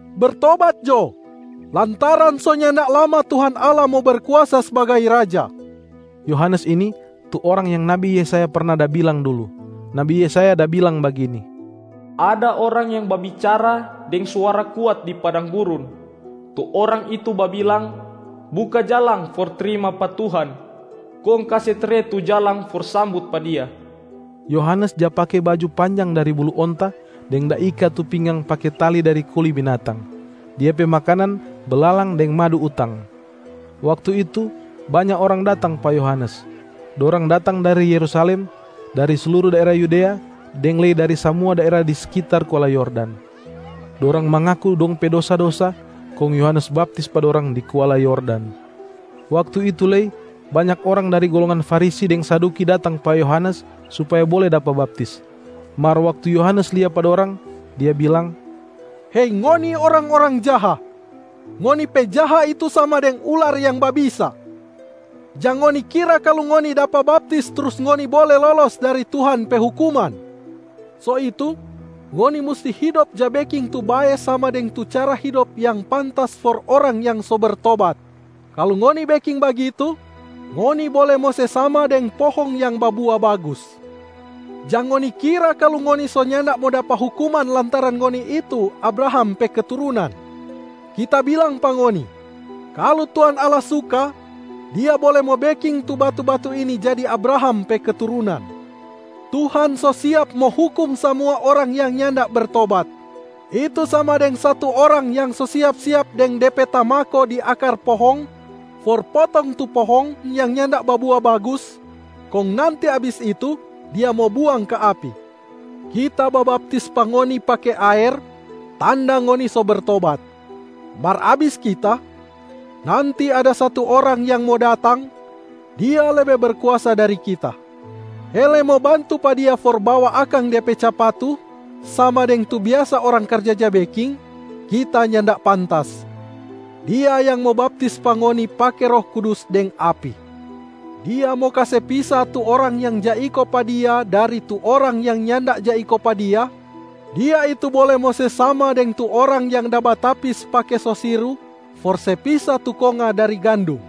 “Bertobat jo lantaran so nyanda lama Tuhan Allah mo Berkuasa sbagai Raja!” Yohanes ini, tu orang yang nabi Yesaya perna da bilang dulu. Nabi Yesaya da bilang bagini, “Ada orang yang babicara deng suara kuat di padang gurun. Tu orang itu babilang, ‘Buka jalang for trima pa Tuhan, kong kase tre tu jalang for sambut pa Dia.’” Yohanes ja pake baju panjang dari bulu onta deng da ika tu pinggang pake tali dari kuli binatang. Dia pe makanan belalang deng madu utang. Waktu itu, banya orang datang pa Yohanes. Dorang datang dari Yerusalem, dari sluru daera Yudea, deng lei dari samua daera di sekitar kuala Yordan. Dorang mangaku dong pe dosa-dosa, kong Yohanes baptis pa dorang di kuala Yordan. Waktu itu lei banya orang dari golongan Farisi deng Saduki datang pa Yohanes supaya bole dapa baptis. Mar waktu Yohanes lia pa dorang, dia bilang, “Hei ngoni orang-orang jaha, ngoni pe jaha itu sama deng ular yang babisa! Jang ngoni kira kalu ngoni dapa baptis trus ngoni bole lolos dari Tuhan pe hukuman. So itu ngoni musti hidop ja beking tu bae sama deng tu cara hidop yang pantas for orang yang so bertobat. Kalu ngoni beking bagitu, ngoni bole mo se sama deng pohong yang babua bagus. Jang ngoni kira kalu ngoni so nyanda mo dapa hukuman lantaran ngoni itu Abraham pe keturunan. Kita bilang pa ngoni, kalu Tuhan Allah suka, Dia bole mo beking tu batu-batu ini jadi Abraham pe keturunan. Tuhan so siap mo hukum samua orang yang nyanda bertobat, itu sama deng satu orang yang so siap-siap deng de pe tamako di akar pohong for potong tu pohong yang nyanda babua bagus, kong nanti abis itu, dia mo buang ka api. Kita babaptis pa ngoni pake aer, tanda ngoni so bertobat. Mar abis kita, nanti ada satu Orang yang mo datang, Dia lebe berkuasa dari kita. Hele mo bantu pa Dia for bawa akang Dia pe capatu sama deng tu biasa orang karja ja beking, kita nyanda pantas. Dia yang mo baptis pa ngoni pake Roh Kudus deng api.a Dia mo kase pisa tu orang yang ja iko pa Dia dari tu orang yang nyanda ja iko pa Dia, Dia itu bole mo se sama deng tu orang yang da batapis pake sosiru for se pisa tu konga dari gandum.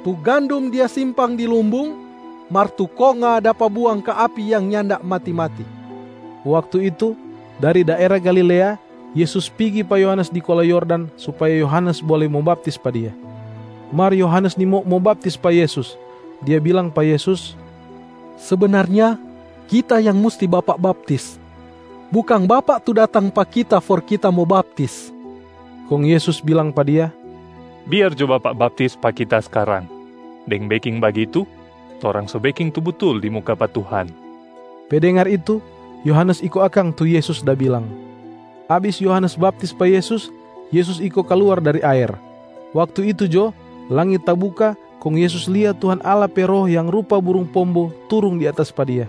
Tu gandum dia simpang di lumbung, mar tu konga dapa buang ka api yang nyanda mati-mati.” Waktu itu, dari daera Galilea Yesus pigi pa Yohanes di kuala Yordan supaya Yohanes bole mo baptis pa Dia. Mar Yohanes nimau mo baptis pa Yesus. Dia bilang pa Yesus, “Sebenarnya kita yang musti Bapak baptis, bukang Bapak tu datang pa kita for kita mo baptis.” Kong Yesus bilang pa dia, “Biar jo bapak baptis pa Kita skarang. Deng beking bagitu, torang so beking tu butul di muka pa Tuhan.” Pe dengar itu, Yohanes iko akang tu Yesus da bilang. Abis Yohanes baptis pa Yesus, Yesus iko kaluar dari aer. Waktu itu jo, langit tabuka kong Yesus lia Tuhan Allah pe Roh yang rupa burung pombo turung di atas pa Dia.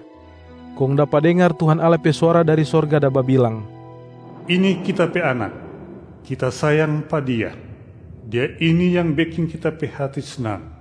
Kong dapa dengar Tuhan Allah pe suara dari sorga da babilang, “Ini Kita pe Anak, Kita sayang pa Dia. Dia ini yang beking Kita pe hati snang.”